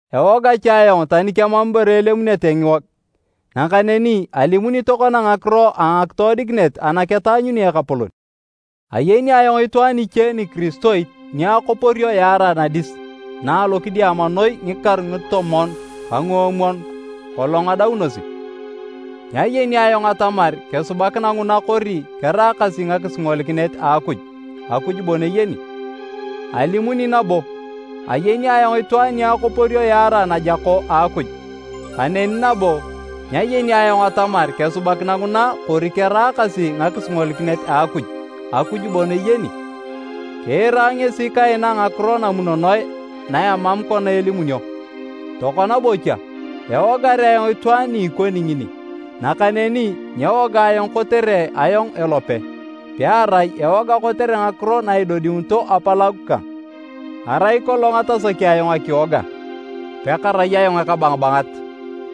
Ewoga cha ayong tani kemam ibore elemunete ngiwog. Nakaneni alimuni tokona ngakiro a ngakitoodikinet ana ketaanyuni Ekapolon. Ayeni ayong itwaan iche nikiristoit ni akoporio yaarae nadis na alokidiama noi ngikaru ngitomon ka nguomwon kolong adaunosi. (Nyayeni ayong atamar kesubakina nguna kori keraakasi ngakisingolikinet a Akuj, Akuj bon eyeni). Alimuni nabo, ayeni ayong itwaan ni akoporio yaarae najako a Akuj. (Kaneni nabo, nyayeni ayong atamar kesubakina nguna kori keraakasi ngakisingolikinet a Akuj, Akuj bon eyeni.) Kiira ngesi kaina ngakiro namunonoe na emam kona elimunio. Tokona bocha, ewogar ayong itwaan ni ikoni ngini, nakaneni nyewoga ayong kotere ayong elope, pearai ewoga kotere ngakiro na idodiunito apalagu kang. Arai kolong atasaki ayong akiwoga, pakarai ayong ekabangabangat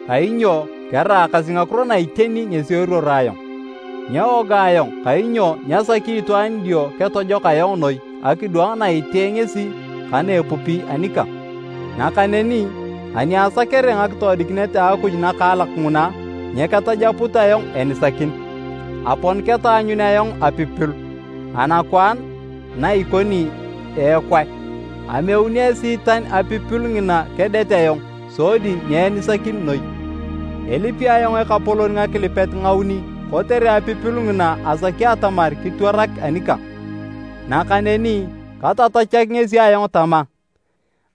kainyo keraakasi ngakiro na iteni ngesi eruoro ayong. Nyewoga ayong kainyo nyasaki itwaan idio ketojok ayong noi akidwang na itee ngesi ka na epupi anikang. Nakaneni ani asakere ngakitoodikinet a Akuj nakaalak nguna nyeketajaput ayong enisakin, apon ketaanyun ayong apipilu anakwaan na ikoni eekwae, ameuni Esiitan apipilu ngina kedet ayong sodi nyeenisakin noi. Elipi ayong Ekapolon ngakilipet ngauni kotere apipilu ngina asaki atamar kitwarak anikang. Nakaneni katatachak ngesi ayong tama,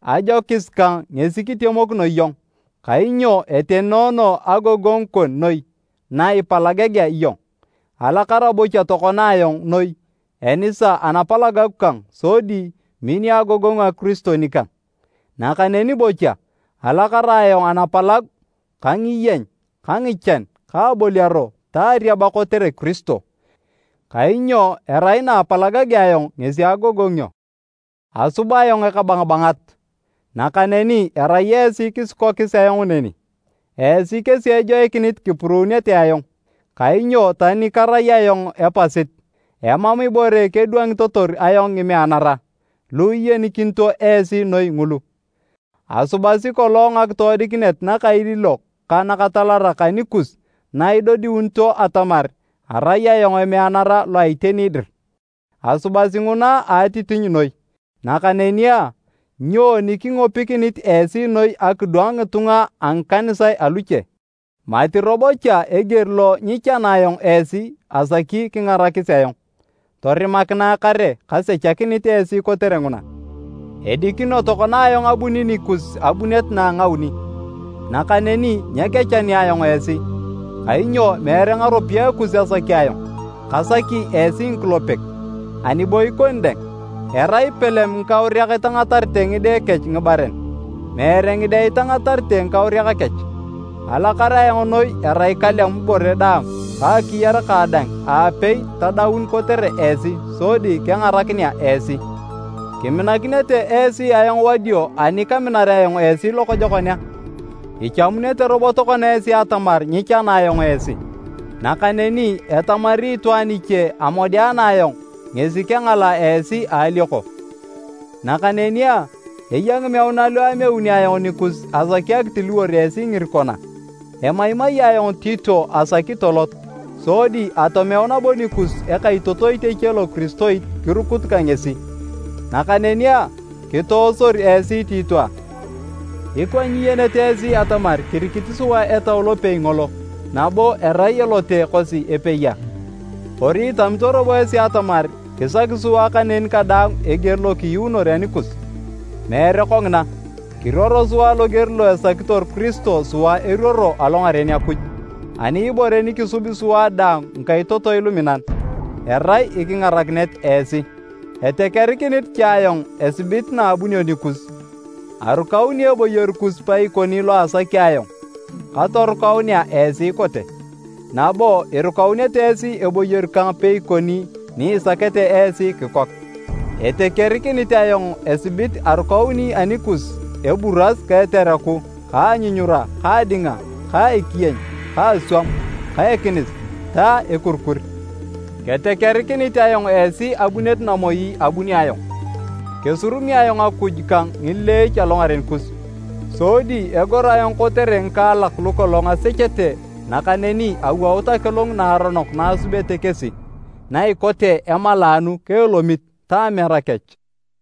“Ajokis kang ngesi kitemokino iyong, kainyo etenoono agogongu kon noi na ipalagagea iyong.” Alakara bocha tokona ayong noi enisa anapalagu kang sodi minio agogongu a Kiristo nikang. Nakaneni bocha, alakara ayong anapalagu ka ngiyeny ka ngichan ka aboliaro ta ariaba kotere Kiristo. Kainyo erai na apalagagea ayong ngesi agogongio. Asub ayong ekabangabangat, nakaneni erai esi kisikokis ayong neni. Esi kesi ejoikinit kipuruunete ayong. Kainyo tani karai ayong epasit, emam ibore kedwangitotor ayong “ngimeanara” lu iyenikinito esi noi ngulu. Asubasi kolong ngakitoodikinet nakailiilok ka nakatalarak anikus na idodiunito atamar arai ayong emeanara lo a iteni dir. Asubasi nguna a atitinyu noi. Nakaneni a, nyoni kingopikinit esi noi akidwang ngitunga a ngikanisae aluche? Mati robo cha eger lo nyichana ayong esi asaki kingarakis ayong. Torimakinae kare kasechakinit esi kotere nguna. Edikino tokona ayong abuni nikus abunet na a ngauni, nakaneni nyekechani ayong esi. Kainyo meere ngaropiyae kus asaki ayong, kasaki esi ngikulepek. Ani bo ikoni dang, erai palem ngikauriak itangatarete ngide kech ngibaren, meere ngide itangatarete ngikauriak kech. Alakar ayong noi erai kalem ibore daang ka akiyar kang dang aapei tadaun kotere esi sodi kengarakinea esi. Kiminakinete esi ayong wadio ani kaminar ayong esi lokojokon a? Ichamunete robo tokona esi atamar nyichana ayong esi. Nakaneni etamari itwaan iche amodeana ayong ngesi kengalaa esi a alioko. Nakaneni a, eya ngimeuna lu ameuni ayong nikus asaki akitiliwor esi ngirikon a? Emaimai ayong Tito asaki tolot, sodi atomeu nabo nikus ekaitotoit eche lokiristoit kirukut ka ngesi. Nakaneni a, kitoosor esi Tito a? Ikwa nyiyenete esi atamar kirikit sua Etau lopei ngolo, nabo erai elote kosi epei a? Kori itamito robo esi atamar kisaki sua kaneni kadaang eger lo kiyuunor anikus. Meere kongina! Kiruoro sua loger lo esakitor Kiristo sua eruoro alongaren Akuj. Ani ibore ni kisubi sua daang ngikaitotoi luminan, erai ikingarakinet esi. Etekerikinit cha ayong esibit naabunio nikus, arukauni eboyor kus paikoni lo asaki ayong katorukaunea esi ikote, nabo irukaunete esi eboyor kang peikoni ni isakete esi kikok. Etekerikinit ayong esibit arukauni anikus eburas ka etereku ka anyunyura ka adinga ka ekiyeny ka aswam ka ekinis ta ekurikur. Ketekerikinit ayong esi abunet namoi abunio ayong, kesurumi ayong Akuj kang ngileech alongaren kus, sodi egor ayong kotere ngikaalak lukolong asechete nakaneni awout akilung naaronok naasubete kesi, na ikote emalaanu ka elomit, ta amera kech.